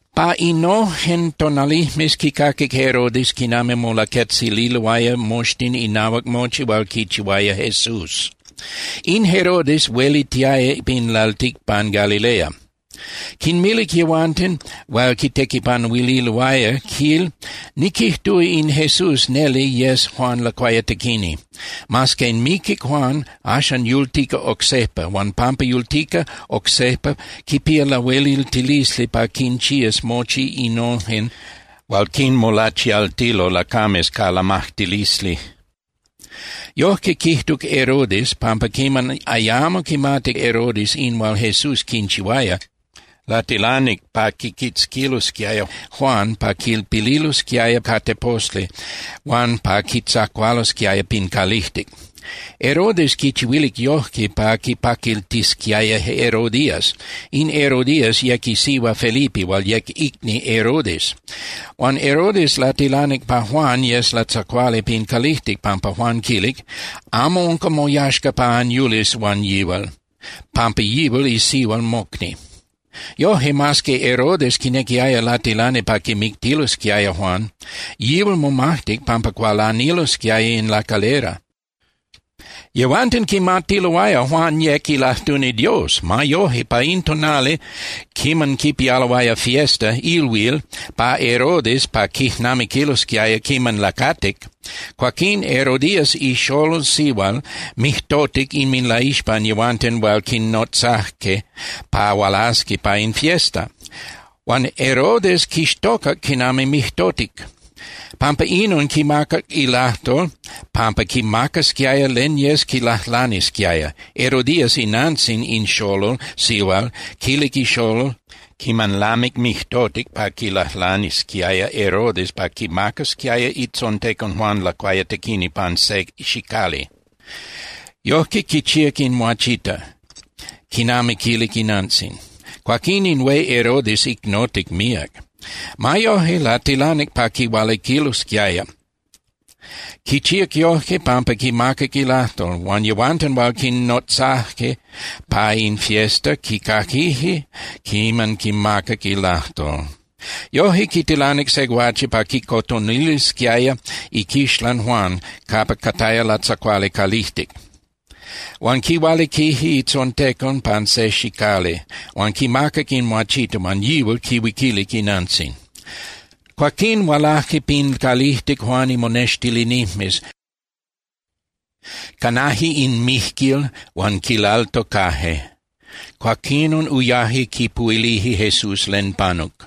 Pa innojen tonalijmes, quicaquic Herodes quinami molaquetzililoaya moxtin inahuac mochi hual quichihuaya Jesús. In Herodes huelitiaya pin lalticpan Galilea. Quinmilic yehuanten hual quitequipanuililoaya, quil: —Niquijtúa in Jesús neli yes Juan Lacuayatequini. Mas que miquic Juan, axan yultica oc sejpa. Huan pampa yultica oc sejpa, quipía lahueliltilisli pa quinchías mochi innojen hual quinmolachialtilo lacames ca lamajtilisli. Yojque quijtuc Herodes, pampa quiman ayamo quimatic Herodes in hual Jesús quinchihuaya, latilanic pa quiquitzquilosquiaya Juan pa quilpililosquiaya ca teposli huan pa quitzacualosquiaya pin calijtic. Herodes quichihuilic yojque pa quipaquiltisquiaya Herodías. In Herodías yec isihua Felipe hual yec icni Herodes. Huan Herodes latilanic pa Juan yes latzacuali pin calijtic pampa Juan quilic: —Amo unca moyaxca pa anyulis huan yihual, pampa yihual isihua mocni. Yoje, mas que Herodes quinequiaya latilani pa quimictilosquiaya Juan, yihual momajtic pampa cualanilosquiaya in lacalera. Yehuanten quimatiloaya Juan yec ilajtuni Dios. Ma yoje, pa in tonali quiman quipialoaya fiesta (ilhuil) pa Herodes pa quijnamiquilosquiaya quiman lacatic, cuaquín Herodías ixolol sihual mijtotic inminlaixpan yehuanten hual quinnotzaje pa hualasi pa in fiesta. Huan Herodes quixtocac quinami mijtotic. Pampa inon quimacac ilajtol pampa quimacasquiaya len yes quilajlanisquiaya. Herodías inantzin in xolol sihual quilic ixolol quiman lamic mijtotic pa quilajlanisquiaya Herodes pa quimacasquiaya itzontecon Juan Lacuayatequini pan se xicali. Yojque quichíac in muachita quinami quilic inantzin. Cuaquín in hué Herodes icnotic míac. Ma yoje latilanic pa quihualiquililosquiaya. Quichíac yojque pampa quimacac ilajtol. Huan yehuanten hual quinnotzaje pa in fiesta quicaquije quiman quimacac ilajtol. Yoje, quitilanic se guache pa quicotonilisquiaya iquixlan Juan capa cataya latzacuali calijtic. Huan quihualiquilic itzontecon pan se xicali, huan quimacac in muachita huan yihual quihuiquilic inantzin. Cuaquín hualaje pin calijtic Juan imonextilinijmes, canaje in mijquil huan quilaltocaje. Cuaquinon uyaje quipuhuilije Jesús len panuc.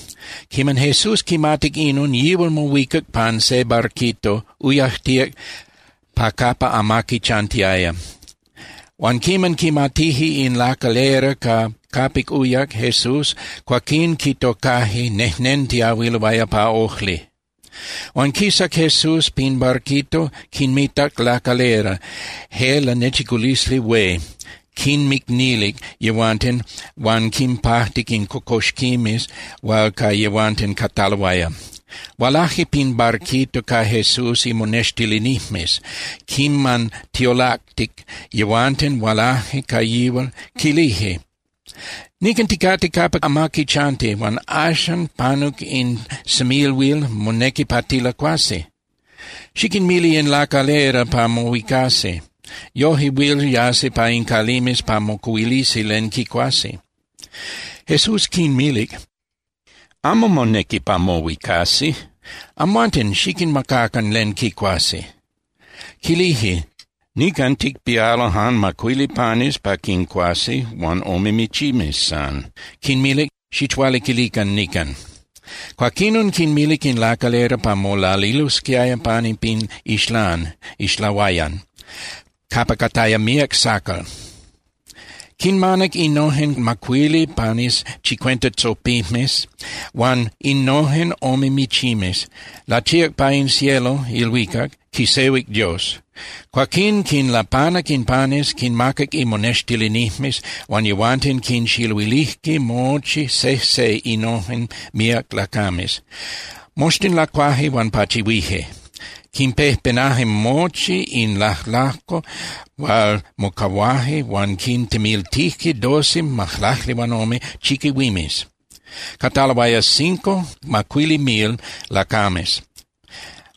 Quiman Jesús quimatic inon, yihual mohuicac pan se barquito, uyajtíac pa capa amaqui chantiaya. Huan quiman quimatije in lacalera ca capic uyac Jesús, cuaquín quitocaje nejnentiyahuiloaya pa ojli. Huan quisac Jesús pin barquito, quinmitac lacalera, je lanechiculisli hué. Quinmicnilic yehuanten huan quinpajtic in cocoxquimes hual ca yehuanten cataloaya. Hualaje pin barquito ca Jesús imonextilinijmes. Quiman tiolactic, yehuanten hualaje ca yihual, quilije: —Nican ticate capa amaqui chanti, huan axan panuc in semilhuil, monequi pa tilacuasi. Xiquinmili in lacalera pa mohuicasi, yoje huil yasi pa in calimes pa mocuhuilisi len quicuasi. Jesús quinmilic: —Amo monequi pa mohuicasi. Amhuanten xiquinmacacan len quicuasi. Quilije: —Nican ticpialo jan macuili panes pa quincuasi huan ome michimes san. Quinmilic: —Xichualiquilican nican. Cuaquinon quinmilic in lacalera pa molalilosquiaya pani pin ixlán (ixlahuayan) capa cataya míac sacal. Quinmanac innojen macuili panes chicuenta tzopimes huan innojen ome michimes, lachíac pa in cielo (ilhuicac), quisehuic Dios. Cuaquín quinlapanac in panes, quinmacac imonextilinijmes, huan yehuanten quinxiluilije mochi sejse innojen míac lacames. Moxtin lacuaje huan pachihuije. Quinpejpenaje mochi in lajlajco hual mocahuaje huan quintemiltije doce (majlaclihuanome) chiquihuimes. Cataloaya cinco (macuili) mil lacames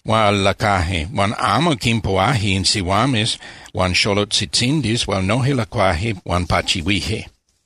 hual lacuaje huan amo quinpuhuaje in sihuames huan xolotzitzindis hual noje lacuaje huan pachihuije.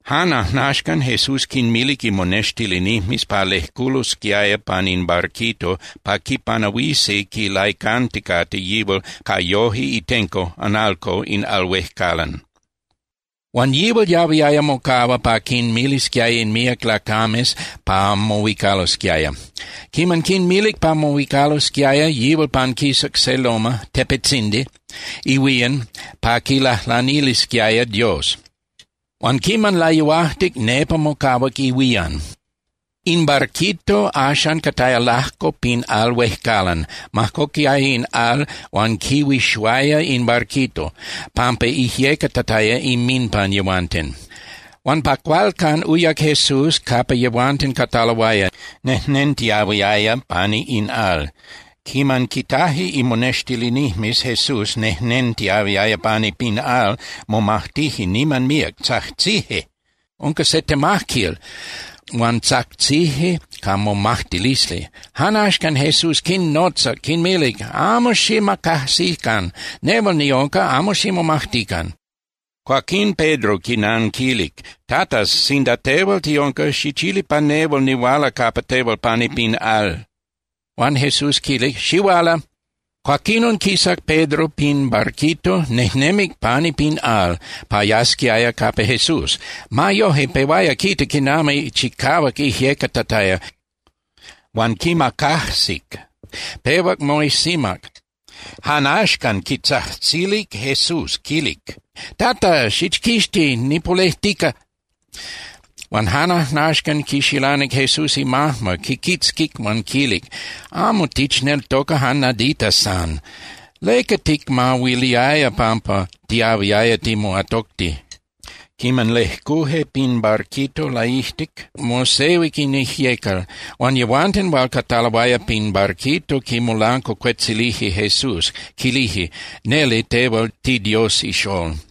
Jan ajnaxcan, Jesús quinmilic imonextilinijmes pa lejculosquiaya pan in barquito pa quipanahuisi quilaicanticate yihual ca yoje itenco (analco) in al huejcalan. Huan yihual yahuiaya mocahua pa quinmilisquiaya in míac lacames pa mohuicalosquiaya. Quiman quinmilic pa mohuicalosquiaya, yihual panquisac se loma (tepetzindi) ihuían pa quilajlanisquiaya Dios. Huan quiman layuajtic, nepa mocahuac ihuían. In barquito axan cataya lajco pin al huejcalan, majcoquiaya in al huan quihuixuaya in barquito, pampa ijyecatataya inminpan yehuanten. Huan pa cualcan, uyac Jesús capa yehuanten cataloaya, nejnentiahuiaya pani in al. Quiman quitaje imonextilinijmes Jesús nejnentiahuiaya pani pin al, momajtije niman míac, tzajtzije: —¡Unca se temajquil! —huan tzajtzije ca momajtilisli. Jan axcan Jesús quinnotzac, quinmilic: —¡Amo xicmacajsican! ¡Nehual niunca, amo ximomajtican! Cuaquín Pedro quinanquilic: —Tata, sinda tehual tiunca, xichili pa nehual nihuala capa tehual pani pin al. Huan Jesús quilic: —Xihuala. Cuaquinon quisac Pedro pin barquito, nejnemic pani pin al pa yasquiaya capa Jesús. Ma yoje, pehuaya quita quinami chicahuac ijyecatataya, huan quimacajsic, pehuac moijsimac. Jan axcan quitzajtzilic Jesús, quilic: —¡Tata, xichquixti, nipolejtica! Huan jan axcan quixilanic Jesús imajma, quiquitzquic huan quilic: —¡Amo tichneltoca jan nadita san! ¿Leca ticmahuiliaya pampa tiahuiaya timoatocti? Quiman lejcuje pin barquito laijtic, mosehuic in ijyecal. Huan yehuanten hual cataloaya pin barquito quimolancuacuetzilije Jesús, quilije: —Neli tehual tiDios iXól.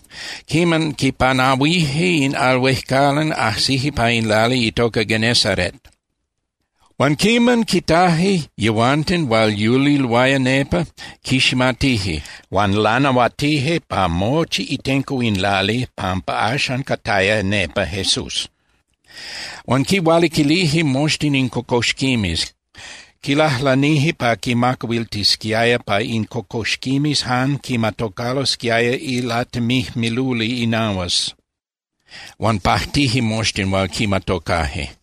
Quiman quipanahuije in al huejcalan, ajsije pa in lali itoca Genesaret. Huan quiman quitaje yehuanten hual yuliloaya nepa, quiximatije, huan lanahuatije pa mochi itenco in lali pampa axan cataya nepa Jesús. Huan quihualiquilije moxtin in cocoxquimes. Quilajlanije pa quinmacahuiltisquiaya pa in cocoxquimes jan quimatocalosquiaya ilatemijmiluli inahuas. Huan pajtije moxtin hual quimatocaje.